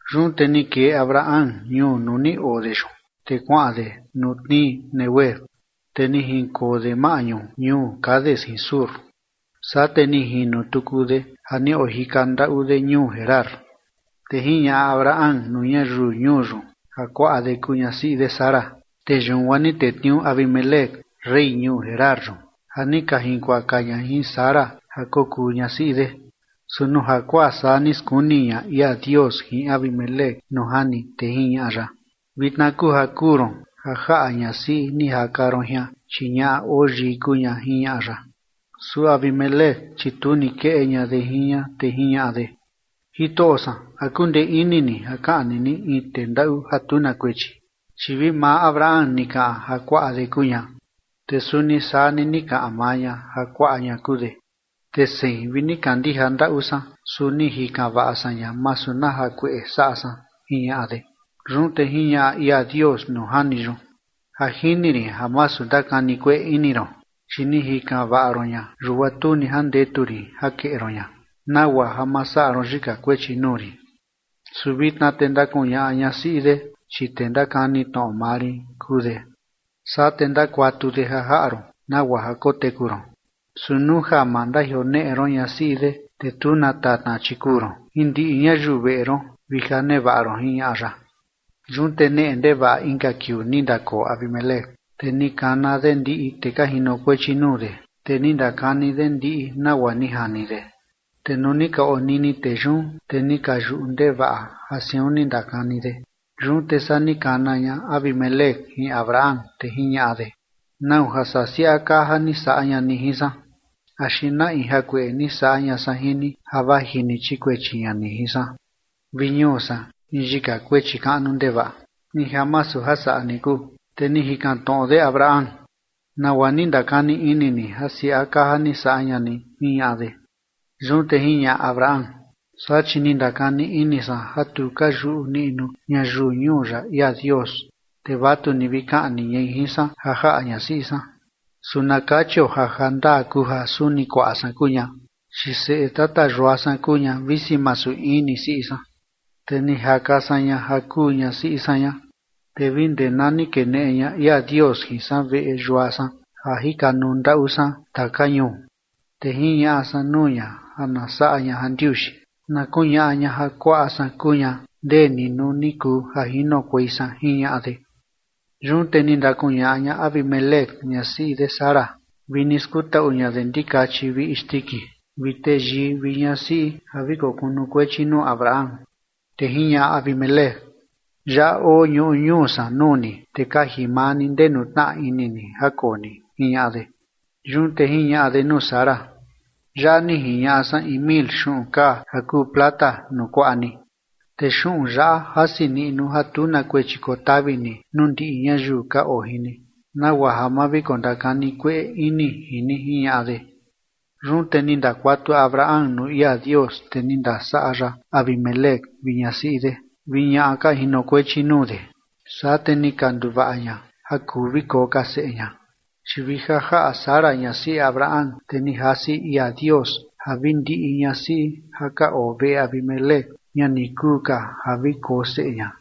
Yun te ni kee Abraham ñuu nuu ni oo de yun, te kuaꞌan de nuu tnii Neguev. Te ni jinkoo de maꞌñu ñuu Cades jin Shur, saa te ni jino tuku de ja ni ojika ndaꞌu de ñuu Gerar. Te jiñaꞌa Abraham nuu ñayiu ñuu yun ja kuaꞌa de kuu ñasiꞌi de Sara. Te yun guaa ni tetniuu Abimelec, rey ñuu Gerar yun, ja ni ka jinkuaka ña jin Sara ja kokuu ñasiꞌi de. Su nuu jakuaa saa ni skuni ña ia Dios jin Abimelec nuu jani, te jiñaꞌa ya: ―Vitna kuu ja kuu ron ja jaꞌa ñasiꞌi ni jaka ron jian, chi ñaꞌa oo yii kuu ña ―jiñaꞌa ya. Su Abimelec, chi tu ni keꞌe ña de jin ña, te jiñaꞌa de: ―Jitoꞌo san, ¿a kundee ini ni ja kaꞌni ni in tee ndaꞌu ja tu na kuechi? Chi vi maa Abraham ni kaꞌan ja kuaꞌa de kuu ña, te suni saa ni ni kaꞌan maa ña ja kuaꞌa ña kuu de. Te sein tu vi ni kandija ndaꞌu san, su ni jikan vaꞌa san ña masu na jakueꞌe saꞌa san ―jiñaꞌa de. Yun te jiñaꞌa ia Dios nuu jani yun: ―Ja jini rin ja masu ndakani kueꞌe ini ron, chi ni jikan vaꞌa ron ña, yun guaa tu ni jandetu rin ja keꞌe ron ña, nagua ja ma saꞌa ron yika kuechi nuu rin. Su vitna te ndakuñaꞌa ñasiꞌi de, chi tee ndakani tnoꞌo maa rin kuu de, saa te ndakuatu de ja jaꞌa ron nagua ja koteku ron. Su nuu ja ma ndajioneꞌe ron ñasiꞌi de, te tu na tatna, chi kuu ron jin ndiꞌi ñayiu veꞌe ron vi ja nevaꞌa ron ―jiñaꞌa ya. Yun te neꞌe ndevaꞌa inka kiuu ni ndakoo Abimelec, te ni kana de ndiꞌi tee ka jinokuechi nuu de, te ni ndakani de ndiꞌi nagua ni jani de, te nuu ni ka onini tee yun te ni ka yuꞌu ndevaꞌa ja siun ni ndakani de. Yun te saa ni kana ña Abimelec jin Abraham, te jiñaꞌa de: ―¿Nau ja saa siaꞌa kaa ja ni saꞌa ña ni jin san? ¿Axi na in jakueꞌe ni saꞌa ña san jin ni ja vaji ni chikuechi ña ni jin san vi ñuu san in yika kuechi kaꞌnu ndevaꞌa, in ja masu ja saꞌa ni kuu? Te ni jikan tnoꞌo de Abraham: ―¿Nagua ni ndakani ini ni ja siaꞌa kaa ja ni saꞌa ña ni? ―jiñaꞌa de. Yun te jiñaꞌa Abraham: ―Saa chi ni ndakani ini san ja tu ka yuꞌu niꞌnu ñayiu ñuu yaꞌa ia Dios, te vatu ni vi kaꞌni ñai jin san ja jaꞌa ñasiꞌi san. Su na kachio ja ja ndaa kuu ja suni kuaꞌa san kuu ña, chi seꞌe tata yua san kuu ña visi masu in ni siꞌi san, te ni jaka san ña ja kuu ñasiꞌi san ña. Te vi ndee na ni keneꞌe ña ia Dios jin san veꞌe yua san ja jikanuu ndaꞌu san taka ñuu, te jiñaꞌa san nuu ña ja na saꞌa ña jandiuxi na kuñaꞌa ña ja kuaꞌa san kuu ña ndeni nuu ni kuu ja jinokuei san ―jiñaꞌa de. Yun te ni ndakuñaꞌa Abimelec ñasiꞌi de Sara vi ni skutaꞌu ña de ndikachi vi isndiki vi teyii vi ñasiꞌi ja vi kokunukuechi nuu Abraham, Te jiñaꞌa Abimelec: ―Yaꞌa oo ñuꞌu ñuu san nuu ni, te kaji maa ni ndenu tnaa ini ni ja koo ni ―jiñaꞌa de. Yun te jiñaꞌa de nuu Sara: ―Yaꞌa ni jiñaꞌa san in mil xuꞌun kaa ja kuu plata nuu kuaꞌa ni, te xuꞌun yaꞌa jasi niꞌnu ja tu na kuechi kotavi ni nuu ndiꞌi ñayiu ka oo jin ni nagua ja ma vi kondakani kueꞌe ini jin ni ―jiñaꞌa de. Yun te ni ndakuatu Abraham nuu ia Dios, te ni ndasaꞌa ya Abimelec vi ñasiꞌi de vi ñaꞌa ka jinokuechi nuu de, saa te ni ka nduvaꞌa ña ja kuu vi koo ka seꞌe ña. Chi vi ja jaꞌa Sara ñasiꞌi Abraham, te ni jasi ia Dios ja vi ndiꞌi tuꞌu ñasiꞌi ja ka oo veꞌe Abimelec, ña ni kuu ka ja vi koo seꞌe ña.